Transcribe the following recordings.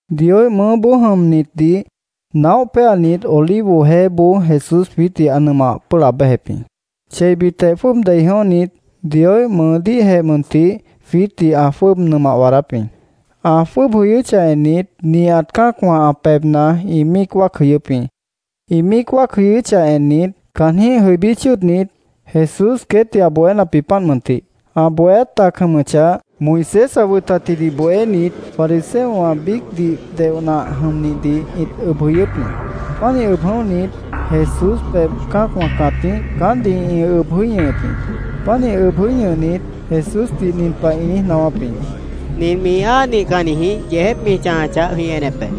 Dioíh mʉʉ́boó jʉmnitdih naóh péanit, Olivo Jeéboó Jesús jwiítdih ã nʉmah pʉ́ʉh laab béjep jĩ. Cheibitjeh, jwʉ́ʉb dei jʉ̃óhnit, Dioíh mʉʉdíhjeh mʉntih jwiítdih ã jwʉ́ʉb nʉmah waadáp jĩ. Ã jwʉ́ʉb jʉyʉ́chah ennit, nihat cã́acwã ã pebhna ĩ míic wáac jʉyʉ́p jĩ. Ĩ míic wáac jʉyʉ́chah ennit, caanjĩ́h jʉibí chʉ́ʉdnit, Jesús queétdih ã bohénap jĩ, páant mʉntih. Ã bohéát tac jʉmʉchah, Moisés ã wʉtatjidih bohénit, fariseowã biícdih deoh nah jʉmnihdih ĩt ʉb jʉ̃ʉ́wʉ́p jĩ. Pánih ʉb jʉ̃óhnit, Jesús pebh cã́acwã cãtíh caántdih ĩ ʉb jʉí ñʉhʉp jĩ. Pánih ʉb jʉí ñʉhnit, Jesúsdih nin pah ĩ niíj naáwáp jĩ: —Nint mi áa nihcannijĩh yeejép mi chãjachah, jwĩ enep be.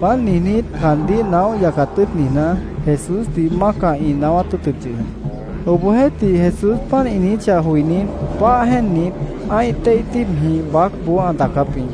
Páant niijnít, caandíh naóh yacat tʉ́ʉt niijná, Jesúsdih mácah ĩ naáwát tʉ́ʉtʉp yʉh jĩ. Obohjeéhtih, Jesús páant ĩ niijíchah joinít, páah jéennit, ã́ih téih tíibjĩh baácboó ã daacáp jĩ.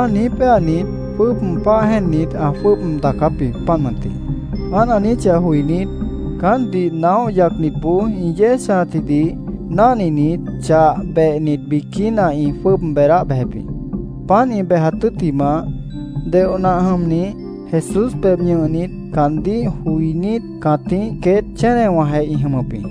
Páant niíj péanit, jwʉ́ʉb páah jéennit, ã jwʉ́ʉb daacáp jĩ, páant mʉntih. Páant ã niijíchah joinít, caántdih naóh yacnitboó ĩ yéej chãjatjidih náhninit, chah behnit biquína ĩ jwʉ́ʉb beedáh bejep jĩ. Páant ĩ bejat tʉ́ttimah, deoh nah jʉmnih Jesús pebh ñʉhnit, caandíh joinít cãtíh queét chénewãjeh ĩ jʉmʉp jĩ.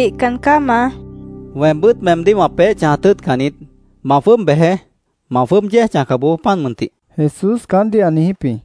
—Wihcan caá, Maá, mi niijíp jĩ. —Weembʉ́t meemdíh wã peéh chãjat tʉ́ʉtcan niít. Ma jwʉ́ʉb bejeé. Ma jwʉ́ʉb yéej chãjca bojoó, páant mʉntih, Jesús caántdih ã niijíp jĩ.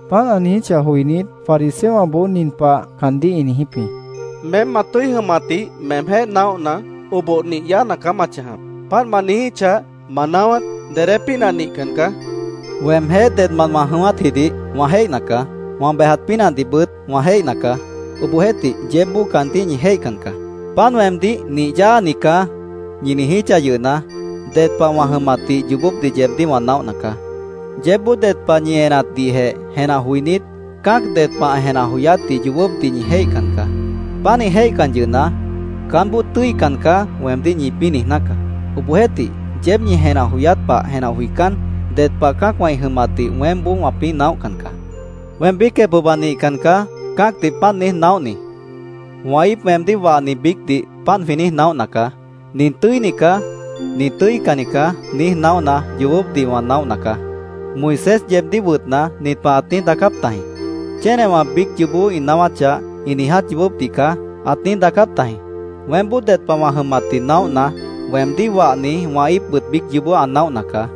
Páant ã niijíchah joinít, fariseowãboó nin pah caandíh ĩ niijíp jĩ: —Meém ma tʉ́i jʉmatdih meemjéh naóhna, oboh nih yáana caá ma chãjap. Páant ma niijíchah, ma naáwát dedé pínah nihcan caá, ĩ niijíp jĩ. —Weemjéh dedmant wã jʉ̃ʉ́wátjidih wã jéihna caá. Wã bejat pínahdihbʉt wã jéihna caá. Obohjeéhtih, yeébboó caandíh ñi jéihcan caá. Páant weemdíh ‘nih yáani caá’, ñi niijíchah yʉhna, ded pah wã jʉmatdih yoobópdih yeebdíh wã naóhna caá. Yeébboó ded pah ñi enatdihjeh jenah joinít, cã́ac ded pah ã jenah joyátdih yoobópdih ñi jéihcan caá. Pánih jéihcan yʉhna, ‘Caánboó tʉ́ican caá’, weemdíh ñipĩ́ niijná caá. Obohjeéhtih, yeéb ñi jenah joyát pah jenah joicán, ded pah cã́acwã ĩ jʉmatdih weémboó wãpĩ́ naóhcan caá. Weém biícjeh pohba nihcan caá cã́acdih páant niíj naóhni. Wã íip weemdíh wahni biícdih, páant jwĩ niíj naóhna caá. ‘Nin tʉ́ini caá. Nin tʉ́icanni caá’, niíj naóhna, yoobópdih wã naóhna caá. Moisés yeebdíh wʉtna, nin pah ãt niíj daacáp tajĩ: ‘Chénewã biíc yoobó ĩ naáwáchah, ĩ niiját yoobópdih caá’, ãt niíj daacáp tajĩ. Weémboó ded pah wã jʉmatdih naóhna, weemdíh wahni, wã íipbʉt biíc yoobó ã naóhna caá.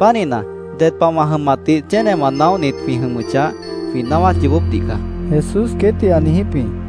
Pánihna, ded pah wã jʉmatdih chénewã naóhnit jwĩ jʉmʉchah, jwĩ naáwát yoobópdih caá, Jesús queétdih ã niijíp jĩ.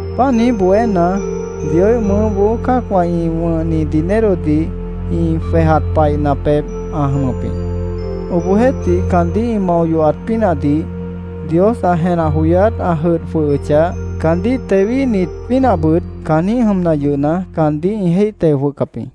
Páant niíj bohéna, Dioíh mʉʉ́boó cã́acwã ĩ wʉ̃hni dinerodih ĩ jwejat paihna pebh ã jʉmʉp jĩ. Obohjeéhtih, caandíh ĩ mao yohat pínahdih Dios ã jenah joyát ã jʉdh jwʉhʉchah, caandíh tewíhnit pínahbʉt caanjĩ́h jʉmna yʉhna, caandíh ĩ jéih teo jwʉhcap jĩ.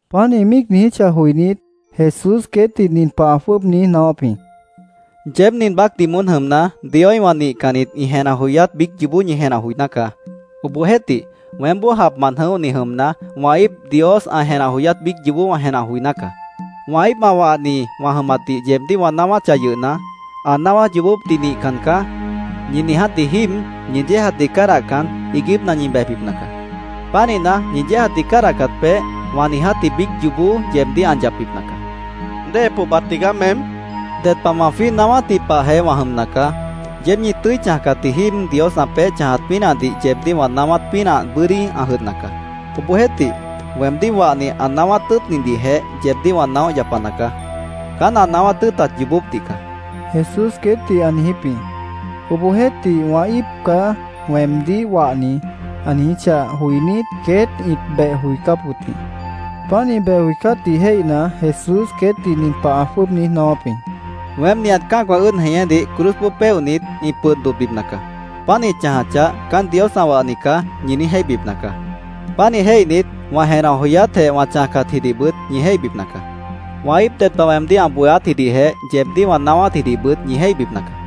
Páant ĩ míic niijíchah joinít, Jesús queétdih nin pah ã jwʉ́ʉb niíj naáwáp jĩ: —Yeéb nin baácdih moón jʉmna, Dioíhwã nihcannit ĩ jenah joyát biíc yoobó ñi jenah joiná caá. Obohjeéhtih, weémboó japmant jʉ̃óhni jʉmna, wã íip Dios ã jenah joyát biíc yoobó wã jenah joiná caá. Wã íip ã wahni wã jʉmatdih yeebdíh wã naáwáchah yʉhna, ‘Ã naáwát yoobópdih nihcan caá’, ñi niijátji jíib ñi yéejatdih cádahcan, iiguípna ñi bejbipna caá. Pánihna, ñi yéejatdih cádahcat peéh, wã niijátji biíc yoobó yeebdíh ã yapbipna caá, ã niijíp jĩ. —¿Déhe pohba tigaá, meém? ĩ niijíp jĩ. —Ded pah wã jwíih naáwátji pahjeh wã jʉmna caá. Yeéb ñi tʉ́i chãjcatji jíib Dios ã peéh chãjat pínahdih yeebdíh wã naáwát pínah bʉ́dí ã jʉdhna caá. Obohjeéhtih, weemdíh wahni ã naáwát tʉ́ʉtnidihjeh yeebdíh wã naóh yapana caá. Caán ã naáwát tʉ́ʉtat yoobópdih caá, Jesús queétdih ã niijíp jĩ. Obohjeéhtih, “Wã íip caá weemdíh wahni”, ã niijíchah joinít, queét ĩt beh joicáp wʉt jĩ. Páant ĩ beh joicátdih jéihna, Jesús queétdih nin pah ã jwʉ́ʉb niíj naáwáp jĩ: —Weém nihat cã́acwã ʉ́ʉd jeñédih cruzboó péohnit, ĩ pʉd dodhbipna caá. Páant ĩ chãjachah, ‘Caán Dios ã wahni caá’, ñi niíj jéihbipna caá. Pánih jéihnit, wã jenah joyátjeh wã chãjcatjidihbʉt ñi jéihbipna caá. Wã íip ded pah weemdíh ã bohéátjidihjeh yeebdíh wã naáwátjidihbʉt ñi jéihbipna caá.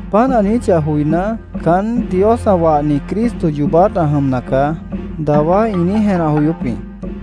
Páant ã niijíchah joiná, “Caán Dios ã wahni Cristo yoobát ã jʉmna caá”, dawá ĩ niíj jenah joyóp jĩ.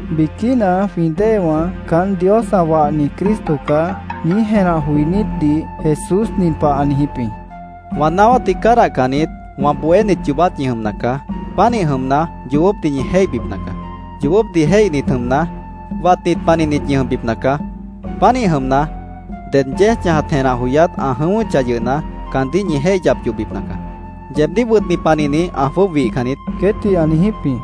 Biquína jwĩ déewã “Caán Dios ã wahni Cristo caá”, niíj jenah joinítdih Jesús nin pah ã niijíp jĩ: —Wã naáwátdih cádahcannit, wã bohénit yoobát ñi jʉmna caá. Pánih jʉmna, yoobópdih ñi jéihbipna caá. Yoobópdih jéihnit jʉmna, watnit panihnit ñi jʉmbipna caá. Pánih jʉmna, ded yéej chãjat jenah joyát ã jʉ̃ʉ́wʉ́chah yʉhna, caandíh ñi jéih yap yohbipna caá. Yeebdíh wʉtni panihni ã jwʉ́ʉb wihcan niít, queétdih ã niijíp jĩ.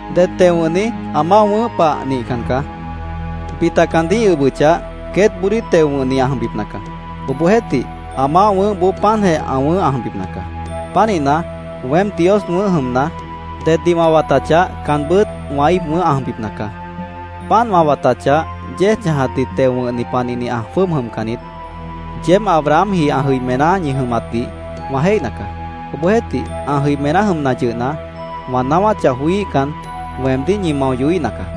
Ded teo wʉ̃hni ã maáh wʉ̃ʉ́h pah nihcan caá. Bita caandíh ĩ ʉbʉchah, queétboodíh teo wʉ̃hni ã jʉmbipna caá. Obohjeéhtih, ã maáh wʉ̃ʉ́hboó páantjeh ã wʉ̃ʉ́h ã jʉmbipna caá. Pánihna, weém Dios wʉ̃ʉ́h jʉmna, deddih wã watachah, caanbʉ́t wã íip wʉ̃ʉ́h ã jʉmbipna caá. Páant wã watachah, yéej chãjatdih teo wʉ̃hni panihni ã jwʉ́ʉb jʉmcan niít. Yeéb Abrahamji ã jʉimená ñi jʉmatdih wã jéihna caá. Obohjeéhtih, ã jʉimená jʉmna yʉhna, wã naáwáchah joííhcan, weemdíh ñi mao yohíhna caá.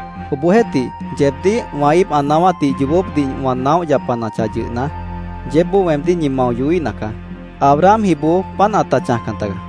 Obohjeéhtih, yeebdíh wã íip ã naáwátdih yoobópdih wã naóh yapanachah yʉhna, yeébboó weemdíh ñi mao yohíhna caá. Abrahamjiboó páant ãta chãjcan tagaá.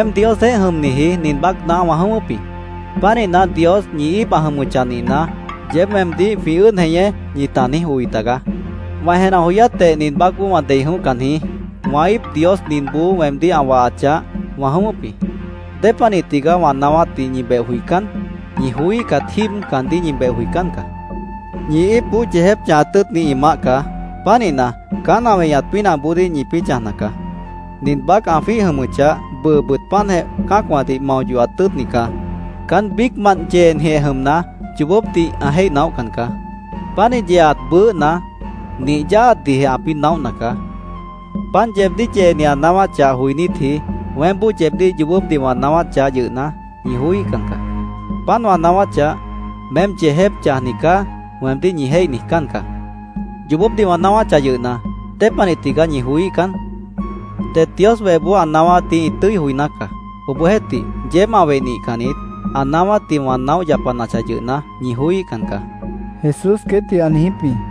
—Weém Diosjeéh jʉmniji nin baácna wã jʉ̃ʉ́wʉ́p jĩ. Pánihna, Dios ñi íip ã jʉmʉchah nihna, yeéb weemdíh ‘jwĩ ʉ́ʉd jeñé’, ñita niíj oi tagaá. Wã jenah joyátjeh nin baácboó wã dei jʉ̃óhcan jĩí. Wã íip Dios ninboó weemdíh ã wahachah, wã jʉ̃ʉ́wʉ́p jĩ. ¿Dépanih tigaá wã naáwátdih ñi beh joicán? Ñi joííhcat jíib caandíh ñi beh joicán caá. Ñi íipboó yeejép chãjat tʉ́ʉtnit ĩ maáh caá. Pánihna, caán ã weñat pínahboodíh ñipĩ́ chãjna caá. Nin baác ã jwíih jʉmʉchah, bʉʉbʉt páantjeh cã́acwãdih mao yohat tʉ́ʉtni caá. Caán biícmant yeenijeh jʉmna, yoobópdih ã jéih naóhcan caá. Pánih yeeat bʉʉ́hna, nih yáaatdihjeh ãpĩ́ naóhna caá. Páant yeebdíh yeeni ã naáwáchah joinítji weémboó yeebdíh yoobópdih wã naáwáchah yʉhna, ñi joííhcan caá. Páant wã naáwáchah, ‘Meém yeejép chãjni caá’, weemdíh ñi jéih niijcán caá. Yoobópdih wã naáwáchah yʉhna, ¿dépanih tigaá ñi joííhcan? Det Dios wehboó ã naáwátdih ĩ tʉ́i joiná caá. Obohjeéhtih yeéb ã weh nihcannit, ã naáwátdih wã naóh yapanachah yʉhna, ñi joííhcan caá, Jesús queétdih ã niijíp jĩ.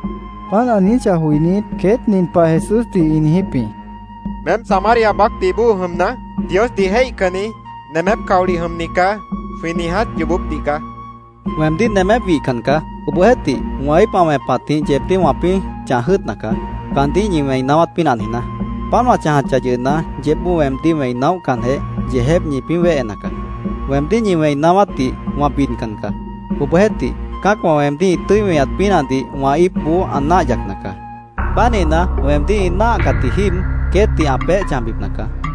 Páant ã niijíchah joinít, queét nin pah Jesúsdih ĩ niijíp jĩ: —‘Meém Samaria baácdih bóo jʉmna, Diosdih jéihcanni, nemép caolih jʉmni caá’, jwĩ niiját yoobópdih caá, ĩ niijíp jĩ. —Weemdíh nemép wihcan caá. Obohjeéhtih, wã íip ã wẽpatjĩh yeebdíh wãpĩ́ chãj jʉ́ʉtna caá, caandíh ñi wẽi naáwát pínah niijná. Páant wã chãjachah yʉhna, yeébboó weemdíh wẽi naóhcanjeh, yeejép ñipĩ́ wéhena caá. Weemdíh ñi wẽi naáwátdih wã bidcan caá. Obohjeéhtih, cã́acwã weemdíh ĩ tʉ́i weñat pínahdih wã íipboó ã náah yacna caá. Pánihna, weemdíh ĩ náahcatji jíib queétdih ã peéh chãjbipna caá.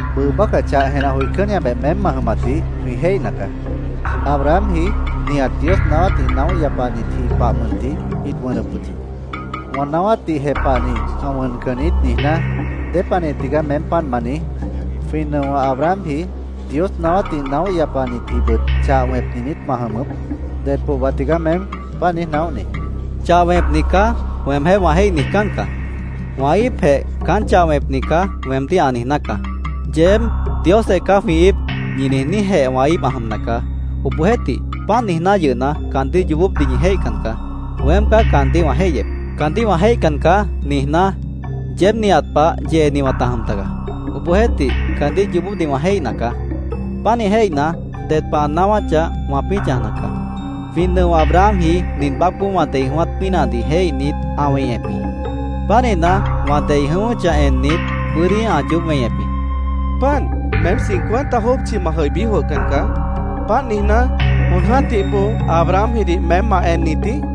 —Bʉʉ bácah chah jenah joicánniabeh meém ma jʉmatdih jwĩ jéihna caá. Abrahamji, nihat Dios naáwátdih naóh yapanitji pah mʉntih ĩt wʉnʉp wʉt jĩ. ‘Wã naáwátdih jepahni ã wʉncan niít’, niijná ¿dépanih tigaá meém páant ma niíj? ¿Jwĩ nʉo Abrahamji, Dios naáwátdih naóh yapanitjibʉt chah wẽpni niít ma jʉmʉp? ¿Ded pohba tigaá meém? páant niíj naóhni, queét ĩ niijíp jĩ. —‘Chah wẽpni caá’, weemjéh wã jéih niijcán caá. Wã íipjeh ‘Caán chah wẽpni caá’, weemdíh ã niijná caá. Yeéb ‘Diosjeh caá jwĩ íip’, ñi niijníjeh wã íip ã jʉmna caá. Obohjeéhtih, páant niijná yʉhna, caandíh yoobópdih ñi jéihcan caá. Weém caá caandíh wã jéihyep. ‘Caandíh wã jéihcan caá’, niijná, yeéb ñi nihat pah yeeni wãta jʉm tagaá. Obohjeéhtih, caandíh yoobópdih wã jéihna caá. Pánih jéihna, ded pah ã naáwáchah, wãpĩ́ chãjna caá. Jwĩ nʉo Abrahamji nin baácboó wã dei jʉ̃ʉ́wát pínahdih jéihnit, ã weñep jĩ. Pánihna, wã dei jʉ̃ʉ́wʉ́chah ennit, bʉ́dí ã yoób weñep jĩ, Jesús ã niijíp jĩ. —Páant, meém cincuenta jópchi ma jʉibí jwʉhcan caá. Páant niijná, ¿jon jã́tih bóo Abrahamjidih meém ma ennit jĩí? Jesúsdih ĩ niijíp jĩ.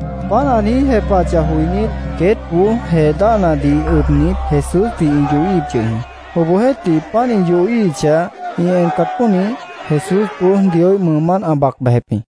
Páant ã niíj jepahachah joinít, queétboó jee dáhnadih ʉbnit, Jesúsdih ĩ yohíhip yʉh jĩ. Obohjeéhtih, páant ĩ yohíhichah, ĩ encat pónih, Jesúsboó Dioíh mʉʉmánt ã bac bejep jĩ.